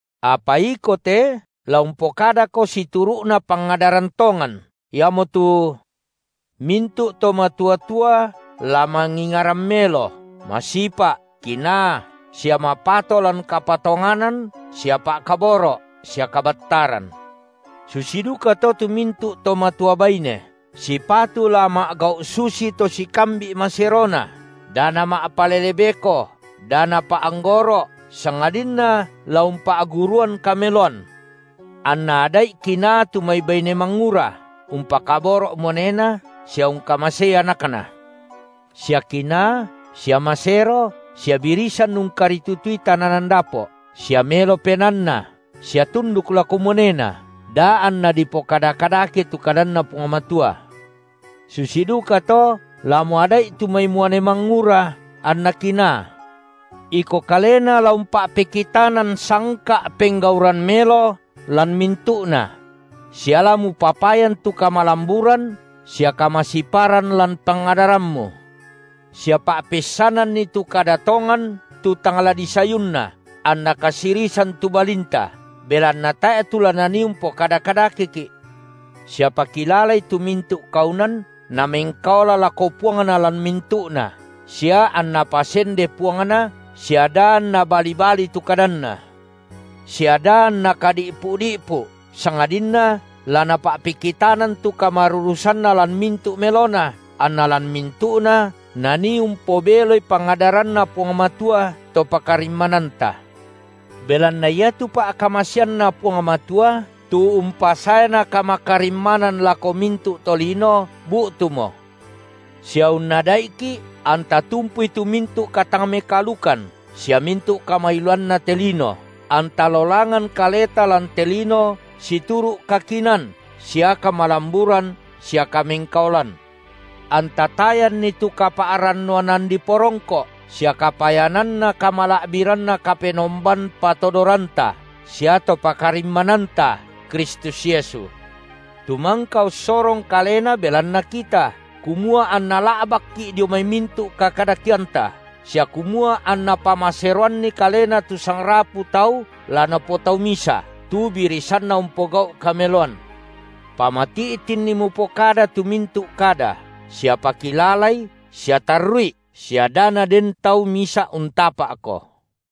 Apa iko te, la umpokadako situru’na pangadaran tongan, iamotu: Mintu’ to matua-tua la mangingaran melo, masipa’, kinaa, sia mapato lan kapatonganan sia pa’kaboro’ sia kabattaran. Susi dukato tu mintu’ to matua baine, sipatu la ma’gau susito sikambi’ maserona, da nama’palele beko, da napa’anggoro’, sangadinna la umpa’guruan kameloan, anna ada’i kinaa tu mai baine mangura, umpakaboro’ muanena, sia ungkamasei anakna, sia kinaa, sia masero, sia birisan ungkaritutui tananan dapo’, sia melo penaanna, sia tunduk lako muanena, da anna dipokada kadake tu kadanNa Puang Matua. Susi dukato la muada’i tu mai muane mangura anna kinaa; iko kalena la umpa’pekitanan sangka’ penggauran melo lan mintu’na; sia la mupapayan tu kamalamburan sia kamasiparan lan pangadarammu, sia pa’peissananni tu kada tongan tu tang la disayunna, anna kasirisan tu balinta, belanna tae’ tu la nanii umpokada kadakeki’. Sia pakilalai tu mintu’ kaunan namengkaola lako puangna lan mintu’na, sia anna pasende puangna sia da anna bali-balii tu kadanna, sia da anna kadi’pu’-di’pu, sangadinna la napa’pekitanan tu kamarurusanna lan mintu’ melona, anna lan mintu’na nanii umpobeloi pangadaranNa Puang Matua, To pakarimmananta. Belanna iatu pa’kamaseanNa Puang Matua, tu umpasaena kamakarimmanan lako mintu’ tolino, bu’tumo, sia unnada’iki’ anta tumpui tu mintu’ katang-mekaalukan sia mintu’ kamailuanna te lino, anta lolangan kaleta lan te lino situru’ kakinaan sia kamalamburan sia kamengkaolan. Anta tayanni tu kapa’rannuanan diporongko’ sia kapayananna kamala’biranNa Kapenomban patodoranta sia To pakarimmananta, Kristus Yesu, tu mangka ussorong Kalena belanna kita, kumua anna la’bakki’ dio mai mintu’ kakadakeanta, sia kumua anna pamaseroanni Kalena tu sangrapu tau la Napotau misa, tu birisanna umpogau’ kameloan. Pamati’tinni mupokada tu mintu’ kada sia pakilalai sia tarru’i sia da naden tau misa’ untapa’ko.